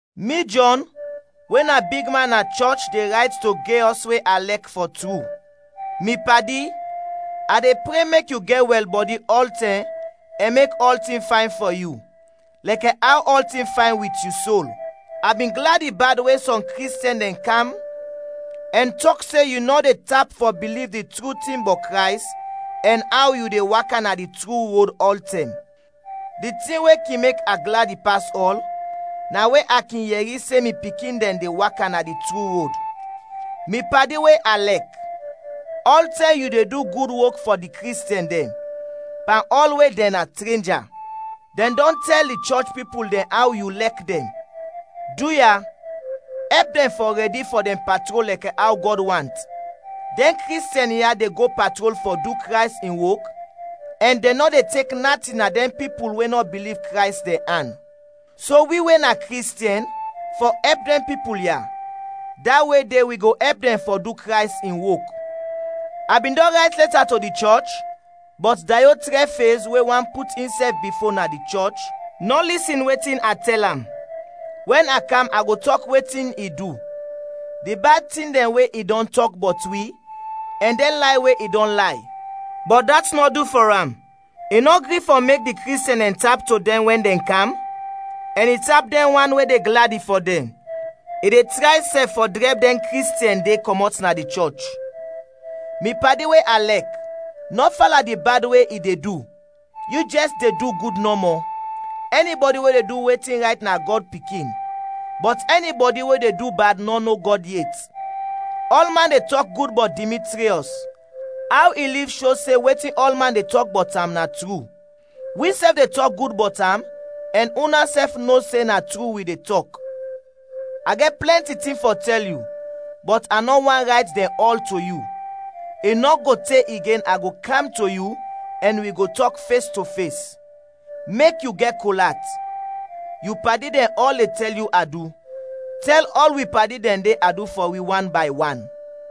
Mi Jɔn, we na bigman na chɔch de rayt to Geyɔs we a lɛk fɔ tru. Mi padi, a de pre mek yu gɛt wɛlbɔdi ɔltɛm ɛn mek ɔltin fayn fɔ yu, lɛkɛ aw ɔltin fayn wit yu sol. A bin gladi bad we sɔm Kristiɛn dɛn kam ɛn tɔk se yu nɔ de tap fɔ biliv di tru tin bɔt Krays ɛn aw yu de waka na di tru rod ɔltɛm. Di tin we kin mek a gladi pas ɔl na we a kin yɛri se mi pikin dɛn de waka na di tru rod. Mi padi we a lɛk, ɔltɛm yu de du gud wok fɔ di Kristiɛn dɛn, pan ɔl we dɛn na trenja. Dɛn dɔn tɛl di chɔch pipul dɛn aw yu lɛk dɛn. Duya, ɛp dɛn fɔ rɛdi fɔ dɛn patrol lɛkɛ aw Gɔd want. Dɛn Kristiɛn ya de go patrol fɔ du Krays in wok ɛn dɛn nɔ de tek natin na dɛn pipul we nɔ biliv Krays, dɛn an. So wi we na Kristiɛn fɔ ɛp dɛn pipul ya, da we de wi go ɛp dɛn fɔ du Krays in wok. A bin dɔn rayt lɛta to di chɔch, bɔt Dayɔtrɛfez we want put insɛf bifo na di chɔch, nɔ lisin wetin a tɛl am. Wɛn a kam a go tɔk wetin i du: di bad tin dɛn we i dɔn tɔk bɔt wi ɛn dɛn lay we i dɔn lay. Bɔt dat nɔ du fɔ am; i nɔ gri fɔ mek di Kristiɛn dɛn tap to dɛn, wɛn dɛn kam, ɛn i tap dɛn wan we de gladi fɔ dɛn, i de tray sɛf fɔ drɛb dɛn Kristiɛn de kɔmɔt na di chɔch. Mi padi we a lɛk, nɔ fala di bad we i de du, yu jɛs de du gud nɔmɔ. Ɛnibɔdi we de du wetin rayt na Gɔd pikin, bɔt ɛnibɔdi we de du bad nɔ no Gɔd yet. Ɔlman de tɔk gud bɔt Dimitriɔs; aw i liv sho se wetin ɔlman de tɔk bɔt am na tru. Wisɛf de tɔk gud bɔt am ɛn unasɛf no se na tru wi de tɔk. A gɛt plɛnti tin fɔ tɛl yu, bɔt a nɔ want rayt dɛn ɔl to yu. I nɔ go te igen a go kam to yu ɛn wi go tɔk fes to fes. Mek yu gɛt kol at. Yu padi dɛn ɔl de tɛl yu adu. Tɛl ɔl wi padi dɛn de adu fɔ wi wan bay wan.